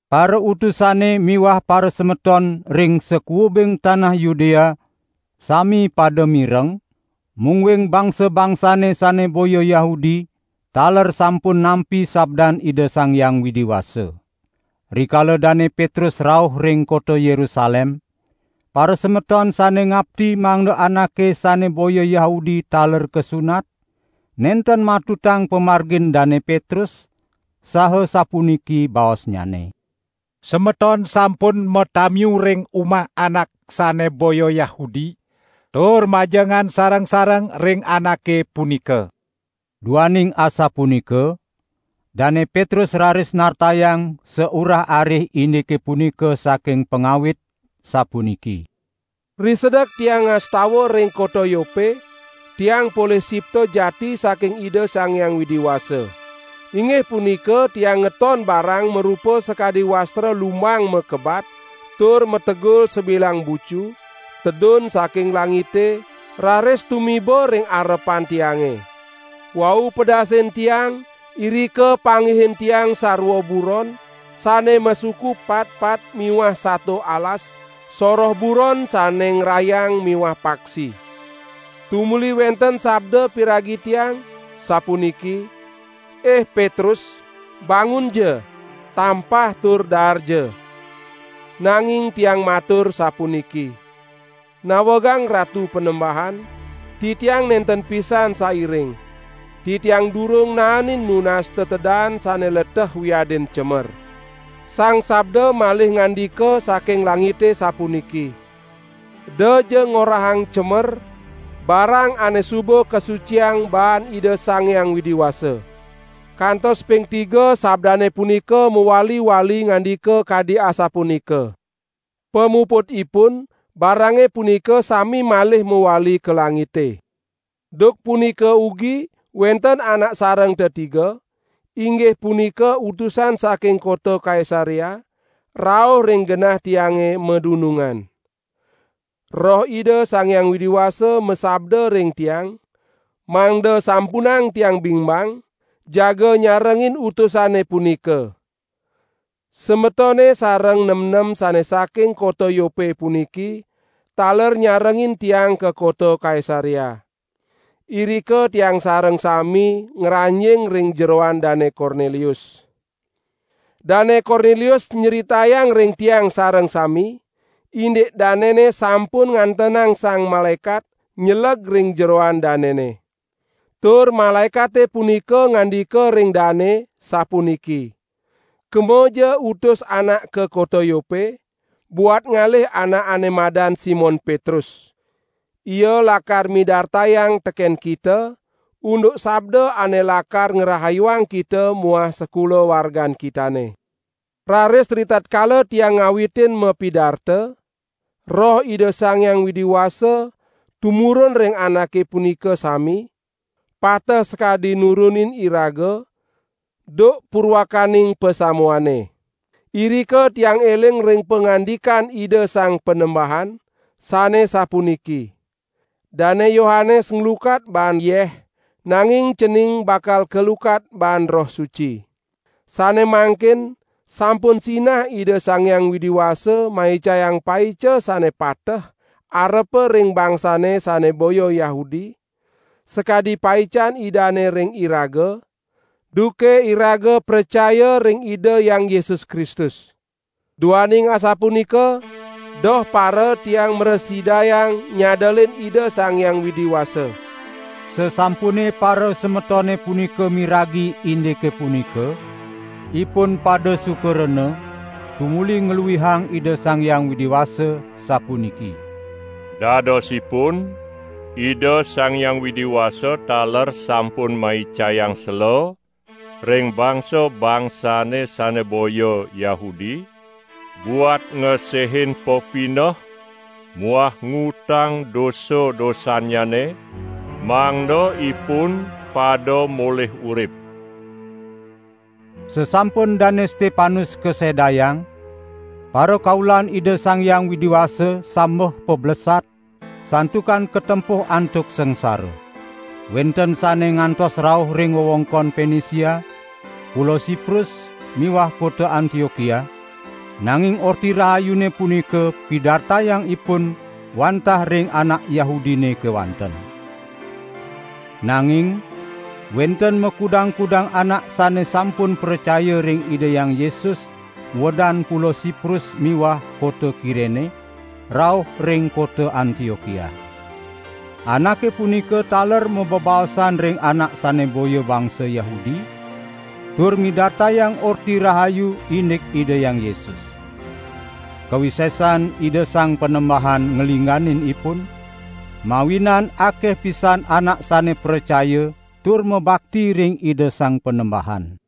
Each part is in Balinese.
Parautusane miwah parasemeton ring sakuubing tanah Yudea sami pada mireng, mungguing bangsa-bangsane sane boya Yahudi taler sampun nampi sabdan Ida Sang Hyang Widi Wasa. Rikala Dane Petrus rauh ring kota Yerusalem, parasemeton sane ngapti mangda anake sane boya Yahudi taler kasunat, nenten matutang pamargin Dane Petrus, saha sapuniki baosnyane: "Semeton sampun matamiu ring umah anak sane boya Yahudi, tur majengan sareng-sareng ring anake punika!" Duaning asapunika, Dane Petrus raris nartayang saurah-arih indike punika saking pangawit, sapuniki: "Risedek tiang ngastawa ring kota Yope, tiang polih sipta jati saking Ida Sang Hyang Widi Wasa. Inggih punika tiang ngeton barang marupa sakadi wastra lumbang makebat tur mategul sabilang bucu, tedun saking langite, raris tumiba ring arepan tiange. Wau pedasin tiang, irika panggihin tiang sarwa buron sane masuku patpat miwah sato alas, soroh buron sane ngrayang miwah paksi. Tumuli wenten sabda piragi tiang, sapuniki: 'Ih Petrus, bangunja! Tampah tur daarja!' Nanging tiang matur sapuniki: 'Nawegang Ratu Panembahan, titiang nenten pisan sairing. Titiang durung naenin nunas tetedaan sane leteh wiadin cemer.' Sang Sabda malih ngandika saking langite sapuniki: 'Edaja ngorahang cemer barang ane suba kasuciang baan Ida Sang Hyang Widi Wasa.' Kantos ping tiga sabdane punika mawali-wali ngandika kadi asapunika. Pamuputipun barange punika sami malih mawali ka langite. Duk punika ugi wenten anak sareng tetiga, inggih punika utusan saking kota Kaisarea, rauh ring genah tiange madunungan. Roh Ida Sang Hyang Widi Wasa masabda ring tiang, mangda sampunang tiang bingbang jaga nyarengin utusane punika. Semetone sareng nemnem sane saking kota Yope puniki, taler nyarengin tiang ka kota Kaisarea. Irika tiang sareng sami ngranjing ring jeroan Dane Kornelius. Dane Kornelius nyritayang ring tiang sareng sami, indik danene sampun ngantenang sang malaekat nyeleg ring jeroan danene. Tur malaekate punika ngandika ring dane, sapuniki: 'Kemaja utus anak ka kota Yope, buat ngalih anak ane madan Simon Petrus! Ia lakar midartayang teken kita, unduk sabda ane lakar ngrahayuang kita muah sakulawargan kitane.' Raris ritatkala tiang ngawitin mapidarta, Roh Ida Sang Hyang Widi Wasa tumurun ring anake punika sami, pateh sakadi nurunin iraga duk purwakaning pasamuane. Irika tiang eling ring pangandikan Ida Sang Panembahan, sane sapuniki: 'Dane Yohanes nglukat baan yeh, nanging cening bakal kalukat baan Roh Suci.' Sane mangkin sampun sinah Ida Sang Hyang Widi Wasa maicayang paica sane pateh arepa ring bangsane sane boya Yahudi, sakadi paican Idane ring iraga, duke iraga pracaya ring Ida Hyang Yesus Kristus. Duaning asapunika doh para tiang mrasidayang nyadelin Ida Sang Hyang Widi Wasa!" Sasampune parasemetone punika miragi indike punika, ipun pada suka rena, tumuli ngluihang Ida Sang Hyang Widi Wasa, sapuniki: "Dadosipun Ida Sang Hyang Widi Wasa taler sampun maicayang sela ring bangsa-bangsane sane boya Yahudi, buat ngesehin pepineh muah ngutang dosa-dosannyane, mangda ipun pada molih urip!" Sasampun Dane Stepanus kasedayang, parakaulan Ida Sang Hyang Widi Wasa sambeh pablesat, santukan katempuh antuk sangsara. Wenten sane ngantos rauh ring wewengkon Penisia, Pulo Siprus miwah kota Antiokia, nanging Orti Rahayune punika pidartayang ipun wantah ring anak Yahudine kewanten. Nanging wenten makudang-kudang anak sane sampun pracaya ring Ida Hyang Yesus, uedan Pulo Siprus miwah kota Kirene, rauh ring kota Antiokia. Anake punika taler mabebaosan ring anak sane boya bangsa Yahudi, tur midartayang Orti Rahayu indik Ida Hyang Yesus. Kawisesan Ida Sang Panembahan nglingganin ipun, mawinan akeh pisan anak sane pracaya tur mabakti ring Ida Sang Panembahan.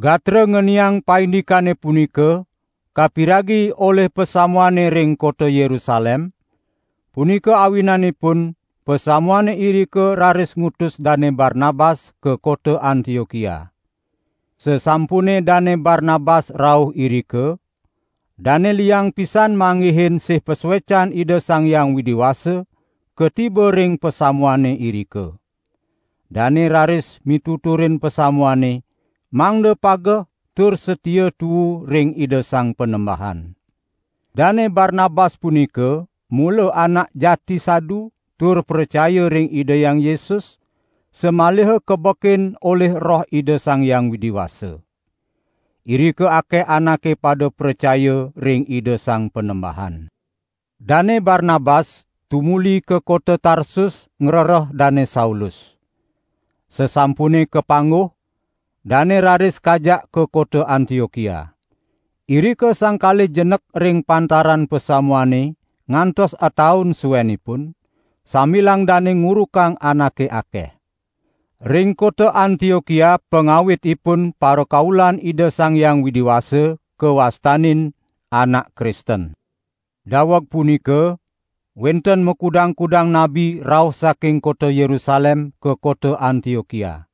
Gatra ngeniang paindikane punika kapiragi olih pasamuane ring kota Yerusalem, punika awinanipun pasamuane irika raris ngutus Dane Barnabas ka kota Antiokia. Sasampune Dane Barnabas rauh irika, dane liang pisan manggihin sih pasuecan Ida Sang Hyang Widi Wasa, katiba ring pasamuane irika. Dane raris mituturin pasamuane mangda pageh tur satia tuu ring Ida Sang Panembahan. Dane Barnabas punika mula anak jati sadu tur pracaya ring Ida Hyang Yesus, samaliha kabekin olih Roh Ida Sang Hyang Widi Wasa. Irika akeh anake pada pracaya ring Ida Sang Panembahan. Dane Barnabas tumuli ka kota Tarsus ngrereh Dane Saulus. Sasampune kapangguh, dane raris kajak ka kota Antiokia. Irika sang kalih jenek ring pantaran pasamuane ngantos ataun suenipun, sambilang dane ngurukang anake akeh. Ring kota Antiokia pangawitipun parakaulan Ida Sang Hyang Widi Wasa kawastanin: Anak Kristen. Daweg punika wenten makudang-kudang nabi rauh saking kota Yerusalem ka kota Antiokia.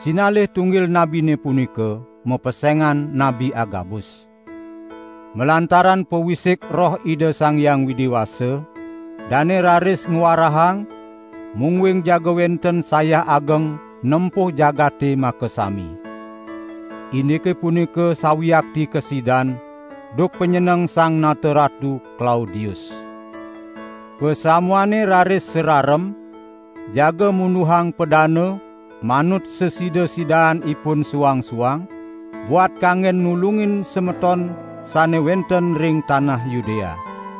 Sinalih tunggil nabine punika mapesengan Nabi Agabus. Malantaran pawisik Roh Ida Sang Hyang Widi Wasa, dane raris ngwarahang, mungguing jaga wenten sayah ageng nempuh jagate makasami. (Indike punika sawiakti kasidan duk panyeneng Sang Nata Ratu Klaudius.) Pasamuane raris sararem, jaga munduhang padana, manut sasida-sidaan ipun suang-suang buat kanggen nulungin semeton sane wenten ring tanah Yudea.